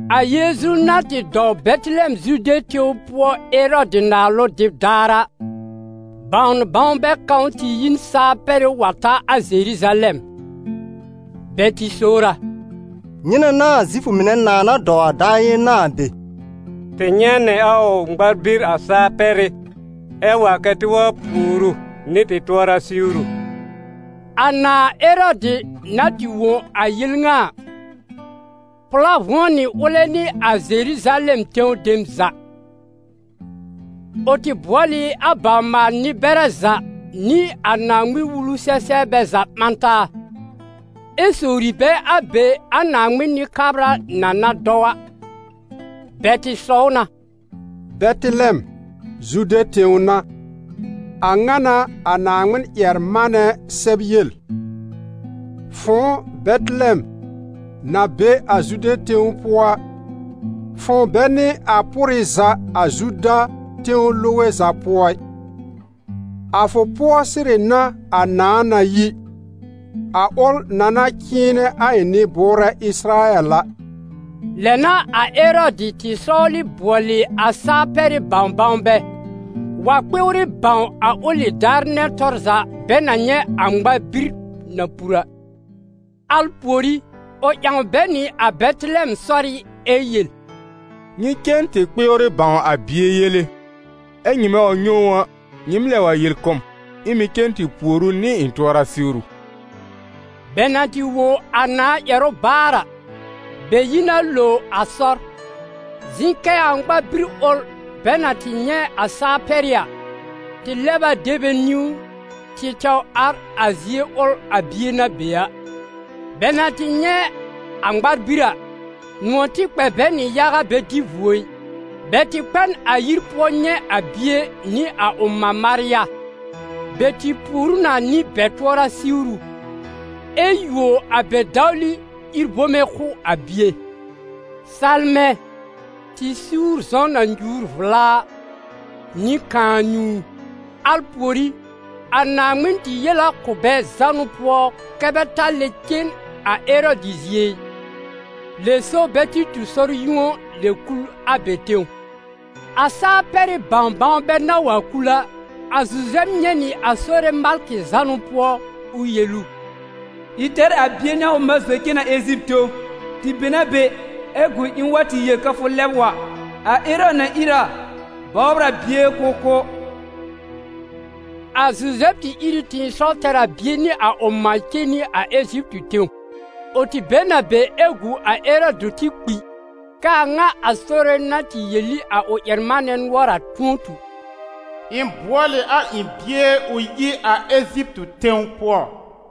A Yeezu na tɩ dɔw Bɛtɩlɛm Zude tẽw pʋɔ Erɔdɩ naalʋ dɩb daar a, bãw-bãwnbɛ kãw tɩ yi n Saa-pɛrɩ́ wa ta a Zeruzalɛm. Bɛ tɩ sowr a: «Nyɩnɛ n'a a Zifʋ mɩnɛ nãà na dɔw a daar yɩ̃ɛ ŋa a be? Tɩ nyɛ̃ nɩ a ʋ ŋmar-bir a Saa-pɛrɩ́ ɛ wa kɛ́ tɩ wa pùor ʋ nɩ tɩ tʋɔra siwru.» A nãà Erɔdɩ na tɩ wõ a yel ŋa a, pʋ̀lá vʋ̃ɔ nɩ ʋlɛ nɩ a Zeruzalɛm tẽw dem za. Ʋ tɩ bʋɔl ɩ a bawr-maal-nɩ-bɛrɛ za nɩ a Naaŋmɩn-Wulu-sɛ-sɛbrbɛ za ɓã taa, ɛ sowri bɛ a be a Naaŋmɩn Nɩ-kabra na na dɔw a. Bɛ tɩ sɔw na: «Bɛtɩlɛm, Zude tẽw n'a. A ŋa n'a a Naaŋmɩn-ƴɛr-manɛ sɛb yel: ‹Fʋ̃ʋ Bɛtɩlɛm na be a Zude tẽw pʋɔ a, fʋ̃ʋ bɛ n'ɩ a pʋrɩ za a Zuda tẽw loge za pʋɔ ɩ; a fʋ pʋɔ sɩrɩ n'a a nãà na yi, a ʋl na na cɩ̃ɩnɛ a ɩ̃ nɩ-bʋʋrɛ Ɩsɩrayɛl a.›» Lɛ n'a a Erɔdɩ tɩ sɔwlɩ bʋɔlɩ a Saa-pɛrɩ́ bãw-bãwnbɛ, wa kpɩwrɩ bãw a ʋlɩ daar nɛ tɔr za bɛ na nyɛ̃ a ŋmar-bir na pur a. Al pùorí, ʋ ƴãw bɛ nɩ a Bɛtɩlɛm sɔrɩ́ ɛ yel: «Nyɩ cen tɩ kpɩwrɩ bãw a bie yele, ɛ nyɩmɛ wa nyɛ̃ ʋ a, nyɩɩm lɛb wa yel kʋ̀ m, ɩ̃ mɩ̀ cen tɩ pùor ʋ nɩ ɩ̃ tʋɔra siwru.» Bɛ na tɩ wõ a nãà ƴɛrʋ baar a, bɛ yi na lo a sɔr. Zɩ̃ kɛ a ŋmar-bir ʋl bɛ na tɩ nyɛ̃ a Saa-pɛrɩ́ a, tɩ lɛb a de bɛ niwn tɩ tɛw ar a zie ʋl a bie na be a. Bɛ na tɩ nyɛ̃ a ŋmar-bir a, nʋ̃ɔ̀ tɩ kpɛ bɛ nɩ yaga bɛ dɩ vuo ɩ. Bɛ tɩ kpɛ n a yir pʋɔ nyɛ̃ a bie nɩ a ʋ mã Marya, bɛ tɩ pùor ʋ na nɩ bɛ tʋɔra siwru, ɛ yuo a bɛ dawli ír bome kʋ̀ a bie: salmɛ̃, tɩ-suur-zɔ̃ na nyuur vla a, nɩ kãa-nyũu. Al pùorí, a Naaŋmɩn tɩ yel a kʋ̀ bɛ zánʋ pʋɔ kɛ́ bɛ ta lɛb cen a Erɔdɩ zie ɩ, lɛ so bɛ tɩ tu sɔr-yũo lɛb kul a bɛ tẽw. A Saa-pɛrɩ́ bãw-bãwnbɛ na wa kul a, a Zuzɛb nyɛ̃ nɩ a Sore malkɩ zánʋ pʋɔ ʋ yel ʋ: «Ìr tɛr a bie nɩ a ʋ mã zɔ cen nɩ a Eziptɩ tẽw, tɩ be n a be ɛ gu ɩ̃ wa tɩ yel kɛ fʋ lɛb wa. A Erɔdɩ na ìr a bɔbr a bie k'ʋʋ kʋ́.» A Zuzɛb tɩ ìr ɩ tɩ̃ɩsɔw tɛr a bie nɩ a ʋ mã cen nɩ a Eziptɩ tẽw. Ʋ tɩ be n a be ɛ gu a Erɔdɩ tɩ kpi, k'aa a ŋa a Sore na tɩ yel ɩ a ʋ ƴɛr-manɛ nʋɔr a tʋ̃ɔ tu: «Ɩ̃ bʋɔl ɩ a ɩ̃ bie ʋ yi a Eziptɩ tẽw pʋɔ.»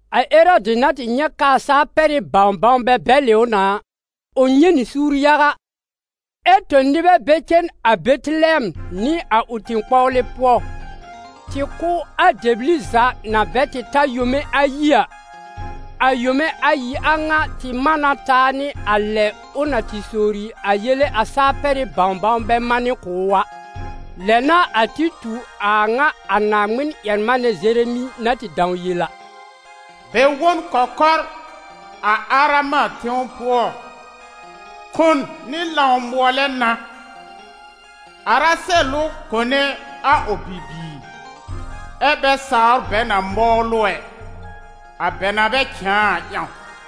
A Erɔdɩ na tɩ nyɛ̃ k'aa Saa-pɛrɩ́ bãw-bãwnbɛ bɛlɩ ʋ na a, ʋ nyɛ̃ nɩ suur yaga, ɛ tõ nɩbɛ bɛ cen a Bɛtɩlɛm nɩ a ʋ tẽ-kpɔwlɩ pʋɔ, tɩ kʋ́ a dɛbli za na bɛ tɩ ta yome ayi a; a yome ayi a ŋa tɩ man na taa nɩ a lɛ ʋ na tɩ sowri a yele a Saa-pɛrɩ́ bãw-bãwnbɛ manɩ kʋ̀ ʋ a. Lɛ n'a a tɩ tu a a ŋa a Naaŋmɩn-ƴɛr-manɛ Zeremi na tɩ dãw yel a: «Bɛ wõ n kɔkɔr a Arama tẽw pʋɔ, kon nɩ lãw-mʋɔlɛ n'a: Arasɛl ʋ kone a ʋ bibiir, ɛ́ bɛ sawr bɛ na mɔwl ʋ ɛ, a bɛ na bɛ cãa a ƴãw.»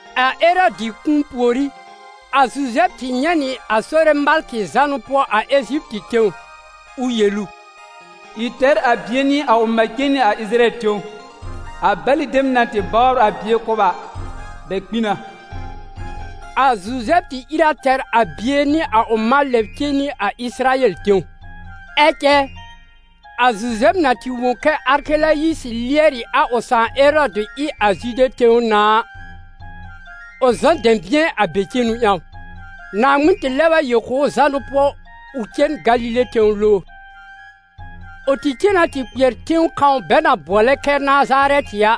A Erɔdɩ kũu pùorí, a Zuzɛb tɩ nyɛ̃ nɩ a Sore malkɩ zánʋ pʋɔ a Eziptɩ tẽw ʋ yel ʋ: «Ìr tɛr a bie nɩ a ʋ mã cen nɩ a Ɩsɩrayɛl tẽw, a bɛlɩ dem na tɩ bɔbr a bie kʋ́b a, bɛ kpi na.» A Zuzɛb tɩ ìr a tɛr a bie nɩ a ʋ mã lɛb cen nɩ a Ɩsɩrayɛl tẽw. Ɛ cɛ, a Zuzɛb na tɩ wõ kɛ Arkelayisɩ lɩɛr ɩ a ʋ sãà Erɔdɩ ɩ a Zude tẽw nãà a, ʋ zɔ n dɛ̃bɩ̃ɛ a be cenu ƴãw. Naaŋmɩn tɩ lɛb a yel kʋ̀ ʋ zánʋ pʋɔ ʋ cen Galile tẽw lowr. Ʋ tɩ cen na tɩ kpɩɛr tẽw kãw bɛ na bʋɔlɛ kɛ Nazarɛtɩ a,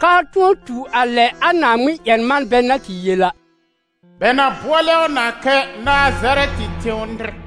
k'aa tʋ̃ɔ tu a lɛ a Naaŋmɩn-ƴɛr-manbɛ na tɩ yel a: «Bɛ na bʋɔlɛ ʋ na kɛ Nazarɛtɩ tẽw nɩr.»